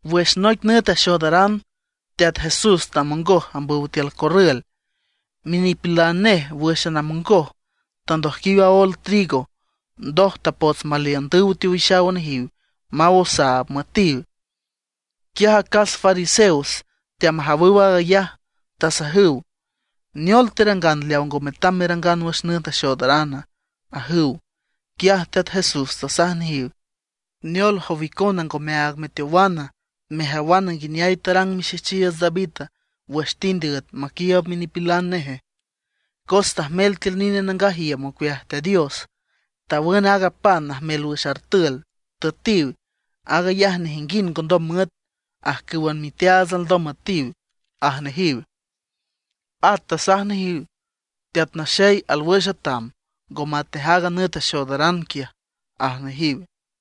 Wüx noic nüt axoodaran, Teat Jesús tamongoj ambüw tiül corrül. Minipilan nej wǘxan amongoj tandojquiw aól trigo, ndoj tapots maliündüw teowixaw nejiw maw osaab müetiw. Quiaj acas fariseos teamajawüw aag ayaj, tasajüw: ―¿Neol terangan leaw ngo metam merangan wüx nüt axoodarana? ―ajüw. Quiaj Teat Jesús tasaj nejiw: ―¿Neol, jow icona ngomeaag meteowana mejawana nguineay tarang mixejchiiüts David wüx tind üet maquiiüb minipilan neje? Cos tajmel tiül nine nangaj iüm ocueaj Teat Dios, tawün aaga pan najmel wüx artül, tüetiw. Aag ayaj nejinguind ngondom müet, ajcǘwan miteaats alndom müetiw ―aj nejiw. At tasaj nejiw: ―Teat Naxey alwüx atam, ngo matnej aaga nüt axoodaran quiaj ―aj nejiw.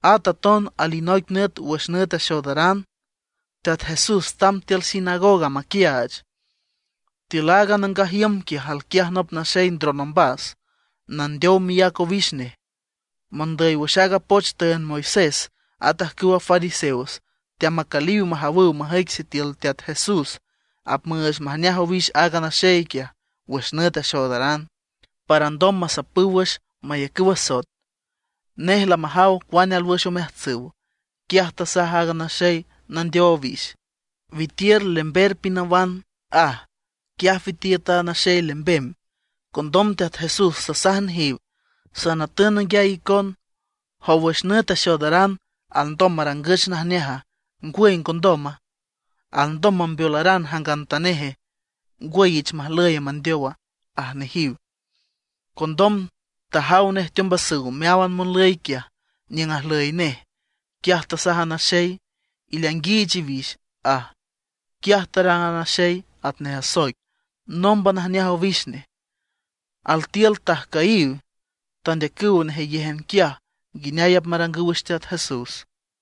At aton alinoic nüt wüx nüt axoodaran Teat Jesús tamb tiül sinagoga maquiaach. Tiül aaga nangaj iüm quiaj alquiaj nop naxey ndron ombas, nandeow miác owix nej. Mondüy wüx aaga poch tüünd Moisés at ajcüwa fariseos teamacüliw majawüw majüic sitiül Teat Jesús apmüüch majneaj owix aaga naxey quiaj wüx nüt axoodaran, para alndom masapüw wüx, mayacüw asoet. Nej lamajaw cuane alwüx omeajtsüw. Quiaj tasaj aaga naxey nandeow owix: ―Witiür lember pinawan ―aj. Quiaj witiüt a naxey lembem. Condom Teat Jesús tasaj nejiw: ―Sanatün nanguiay icon: ¿Jow wüx nüt axoodaran, alndom marangüch najneaja, ngwüy ngondoma? ¿Alndom mambeolaran jangantaneje, ngwüy ich majlüye mandeowa? ―aj nejiw. Condom tajaw nej teombasüw meáwan monlüy quiaj niüng ajlüy nej, quiaj tasaj a naxey: ―Ileainguiich iwix ―aj. Quiaj tarang a naxey atnej asoic; nómban ajneaj owix nej. Altiül tajcüyiw, tandeacüw nejeyéjan quiaj nguineay apmarangüw wüx Teat Jesús.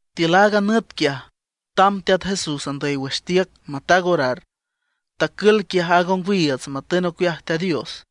Tiül aaga nüt quiaj tamb Teat Jesús andüy wüx tiüc mataag orar, tacül quiaj aaga ongwiiüts matün ocueaj Teat Dios.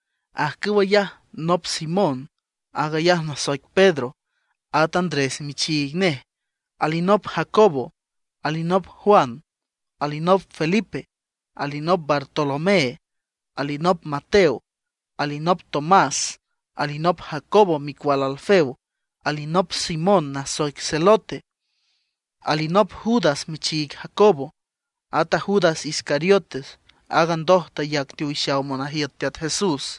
Ajcüw ayaj: nop Simón, aag ayaj nasoic Pedro, at Andrés michiig nej. Alinop Jacobo, alinop Juan, alinop Felipe, alinop Bartolomé, alinop Mateo, alinop Tomás, alinop Jacobo micual Alfeo, alinop Simón nasoic Zelote, alinop Judas michiig Jacobo. Ata Judas Iscariote, aaga ndoj tayac teowixaw monajiüt a Teat Jesús.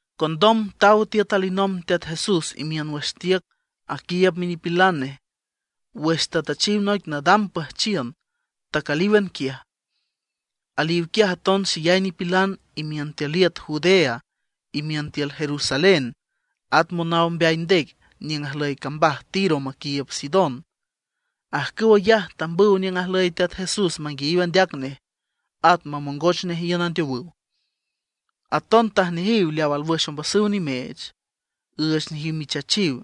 Condom taw tiüt alinomb Teat Jesús imiün wüx tiüc aquiiüb minipilan nej. Wüx tatüchiw noic nadam püjchiün tacülíwan quiaj. Aliw quiaj aton xeyay nipilan imiün tiül iüt Judea, imiün tiül Jerusalén, at monaw mbeay ndec niüng ajlüy cambaj Tiro maquiiüb Sidón. Ajcüw ayaj tambüw niüng ajlüy Teat Jesús manguiayiw andeac nej; at mamongoch nej iün andeowüw. Aton tajneajiw leaw alwüx ombasüw nimeech, üüch nejiw michachiw.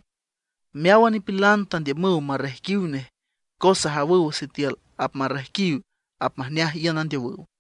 Meáwan nipilan tandiümüw marrejquiw nej, cos ajawüw sitiül apmarrejquiw apmajneaj iün andeowüw.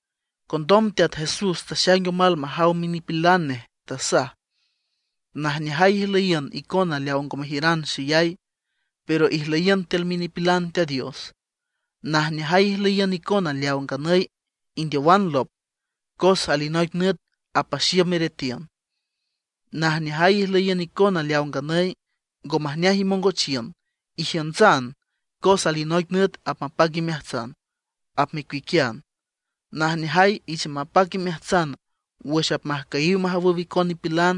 Condom Teat Jesús taxaing omal majaw minipilan nej, tasaj: ―Najneajay ijlüyiün icona leaw ngo mejiüran xeyay, pero ijlüyiün tiül minipilan Teat Dios. ’Najneajay ijlüyiün icona leaw nganüy indeowan lop, cos alinoic nüt apaxiüm iretiün. ’Najneajay ijlüyiün icona leaw nganüy ngo majneaj imongochiün, ijiüntsan, cos alinoic nüt apmapac imeajtsan, apmecuiquian. ’Najneajay ich mapac imeajtsan wüx apmajcüyiw majawüw icon nipilan,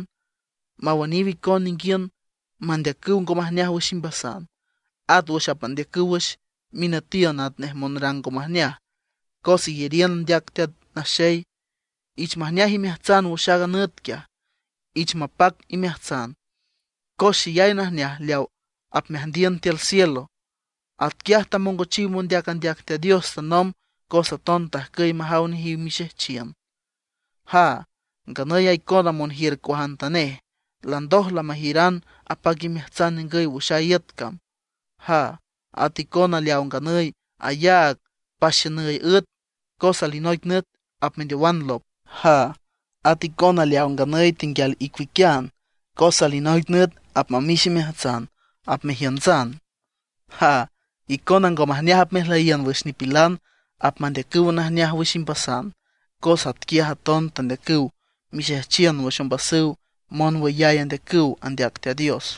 mawüniw icon ninguiün mandeacüw ngo majneaj wüx imbasan. At wüx apmandeacüw wüx minütiün atnej monrang ngo majneaj cos iyariün andeac Teat Naxey. Ich majneaj imeajtsan wüx aaga nüt quiaj, ich mapac imeajtsan, cos xeyay najneaj leaw apmeajndiün tiül cielo. Atquiaj tamongochiw mondeac andeac Teat Dios tanomb; cos aton tajcüy majaw nejiw mixejchiün. ’¡Jaa! Nganüy a icona monjiür cuajantanej, landoj lamejiüran apac imeajtsan ningüy wüx a iüt cam. ’¡Jaa! Ata icona leaw nganüy ayaag paxiünüy üet cos alinoic nüt apmendeowan lop. ’¡Jaa! Aton icona leaw nganüy tenguial icuiquian, cos alinoic nüt apmamix imeajtsan, apmejiüntsan. ’¡Jaa! Icona ngo majneaj apmejlüyiün wüx nipilan apmandeacüw najneaj wüx imbasan, cos atquiaj aton tandeacüw mixejchiün wüx ombasüw monwüyay andeacüw andeac Teat Dios.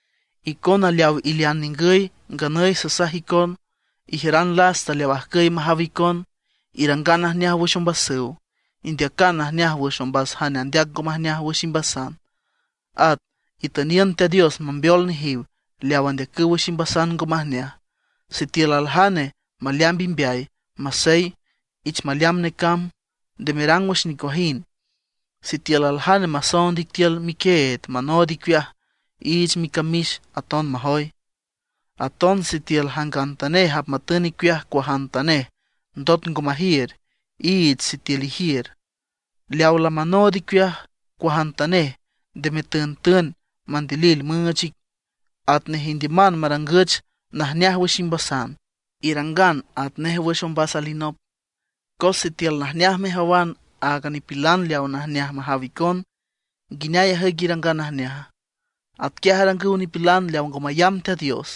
’Icona leaw ilean ningüy nganüy sasaj icon: Ijiüran lasta leaw ajcüy majaw icon; irangan najneaj wüx ombasüw. Indeacan najneaj wüx ombas jane andeac ngo majneaj wüx imbasan. At itüniün Teat Dios mambeol nejiw leaw andeacüw wüx imbasan ngo majneaj. Sitiül aljane maleamb imbeay, masey, ich maleamb necamb, nde merang wüx nicuajind. Sitiül aljane masoond ic tiül miquieed manood icueaj, iich micamix aton majoy. Aton sitiül jangantanej apmatün icueaj cuajantanej ndot ngo majiür, iich sitiül ijiür. Leaw lamanood icueaj cuajantanej nde metüntün mandilil müüch ic. Atnej indiüman marangüch najneaj wüx imbasan, irangan atnej wüx ombas alinop. ’Cos sitiül najneaj mejawan áagan nipilan leaw najneaj majaw icon, ¿nguineay ajüic irangan najneaja? Atquiaj arangüw nipilan leaw ngo mayamb Teat Dios,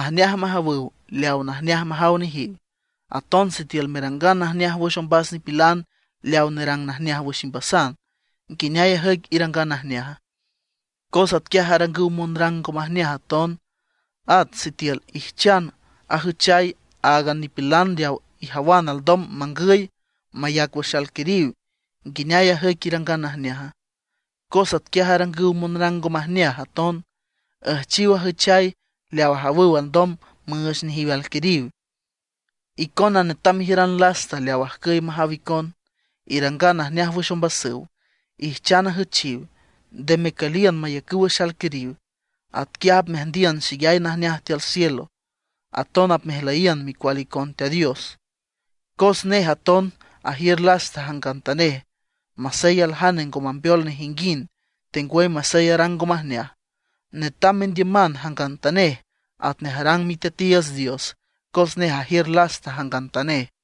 ajneaj majawüw leaw najneaj majaw nejiw. Aton sitiül merangan najneaj wüx ombas nipilan leaw nerang najneaj wüx imbasan, ¿nguineay ajüic irangan najneaja? Cos atquiaj arangüw monrang ngo majneaj aton. At sitiül ijchan ajüchay áagan nipilan leaw ijawan alndom mangüy, mayac wüx alquiriw, ¿nguineay ajüic irangan najneaja? Cos atquiaj arangüw monrang ngo majneaj aton, üjchiw ajüchay leaw ajawüw alndom müüch nejiw alquiriw. Icona netam mejiüran lasta leaw ajcüy majaw icon, irangan najneaj wüx ombasüw, ijchan ajüchiw, nde mecüliün mayacüw wüx alquiriw. Atquiaj apmeajndiün xeyay najneaj tiül cielo, aton apmejlüyiün micual icon Teat Dios. Cos nej aton ajiür lasta jangantanej, masey aljane ngo mambeol nejinguind, tengwüy masey arang ngo majneaj. Netam mendiüman jangantanej atnej arang Miteatiiüts Dios, cos nej ajiür lasta jangantanej.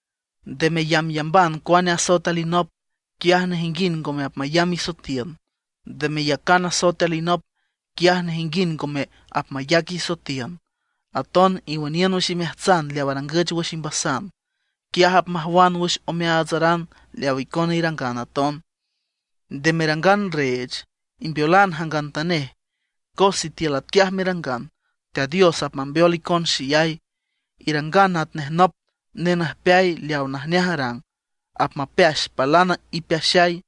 ’Nde meyambyamban cuane asoet alinop, quiaj nejinguind ngome apmayamb isoetiün. Nde meyacan asoet alinop, quiaj nejinguind ngome apmayac isoetiün. Aton iwüniün wüx imeajtsan leaw arangüch wüx imbasan, quiaj apmajwan wüx omeaatsaran leawa icona irangan aton. Nde merangan reech, imbeolan jangantanej, cos sitiül atquiaj merangan, Teat Dios apmambeol icon xeyay. Irangan atnej nop nenüjpeay leaw najneaj arang; apmapeax palan ipeaxay.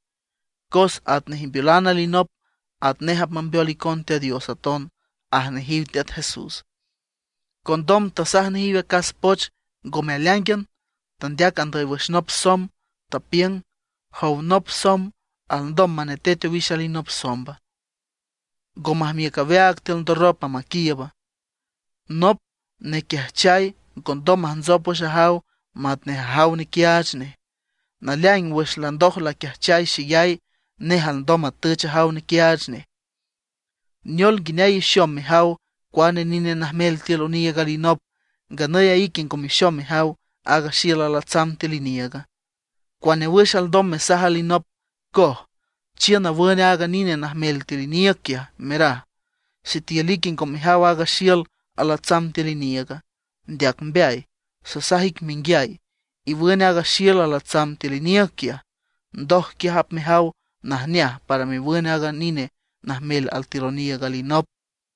Cos atnej imbeolan alinop, atnej apmambeol icon Teat Dios aton ―aj nejiw Teat Jesús. Condom tasaj nejiw acas poch ngome aleáingan, tandeac andüy wüx nop somb, tapiüng: ―Jow nop somb ¿alndom manetet owix alinop somba? ¿Ngo majmiüc aweaag tiül ndorropa maquiiüba? Nop nequiajchay ngondom majntsop wüx ajaw matnej ajaw nequiaach nej. Naleaing wüx landoj laquiajchay xeyay, nej alndom matüch ajaw nequiaach nej. ’¿Neol nguineay ixom mejaw cuane nine najmel tiül oniiüg alinop, nganüy a ique ngo mexom mejaw aaga xiül alatsam tiül iniiüga? ¿Cuane wüx alndom mesaj alinop: “Coj, chiün nawün aaga nine najmel tiül iniiüg quiaj”, meraj, sitiül ique ngo mejaw aaga xiül alatsam tiül iniiüga? ¡Ndeac mbeay! Sasaj ic menguiay, iwün aaga xiül alatsam tiül iniiüg quiaj, ndoj quiaj apmejaw najneaj para mewün aaga nine najmel altiül oniiüg alinop.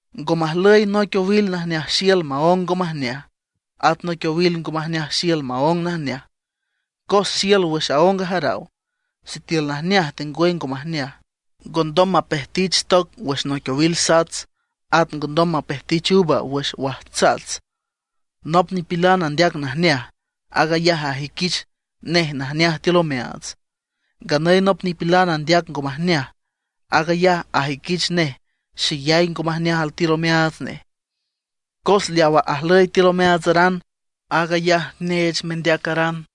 ’Ngo majlüy noic owil najneaj xiül maóng ngo majneaj, at noic owil ngo majneaj xiül maóng najneaj. Cos xiül wüx aóng ajaraw sitiül najneaj tengwüy ngo majneaj. Ngondom mapejtich toc wüx noic owil sats; at ngondom mapejtich uva wüx wajtsats. Nop nipilan andeac najneaj, aag ayaj ajüiquich nej najneaj altiül omeaats. Nganüy nop nipilan andeac ngo majneaj; aag ayaj ajüiquich nej xeyay ngo majneaj altiül omeaats nej. Cos leawa ajlüy tiül omeaatsaran, aag ayaj neech mendeacaran.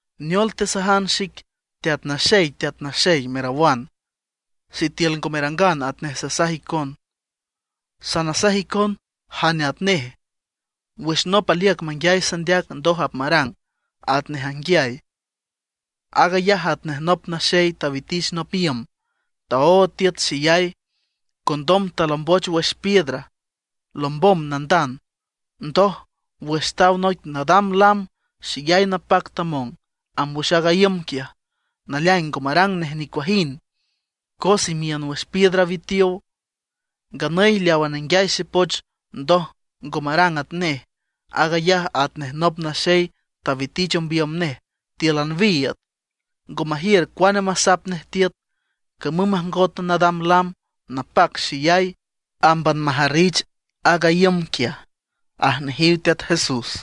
’¿Neol tesajan xic: “Teat Naxey, Teat Naxey”, merawan, sitiül ngo merangan atnej sasaj icon? Sanasaj icon jane atnej. Wüx nop aliüc manguiay sandeac ndoj apmarang atnej anguiay, aag ayaj atnej nop naxey tawitich nop iüm, taood tiüt xeyay, condom talomboch wüx piedra, lombom nandand. Ndoj, wüx taw noic nadam lam xeyay napac tamong amb wüx a iüm quiaj. Naleaing ngo marang nej nicuajind cos imiün wüx piedra witiow. Nganüy leawa nenguiay xepoch ndoj ngo marang atnej, aag ayaj atnej nop naxey tawitich ombiüm nej tíülan wiiüd, ngo majiür cuane masap nej tiüt. Camüm majngot nadam lam napac xeyay, ámban majarrich aaga iüm quiaj, aj nejiw Teat Jesús.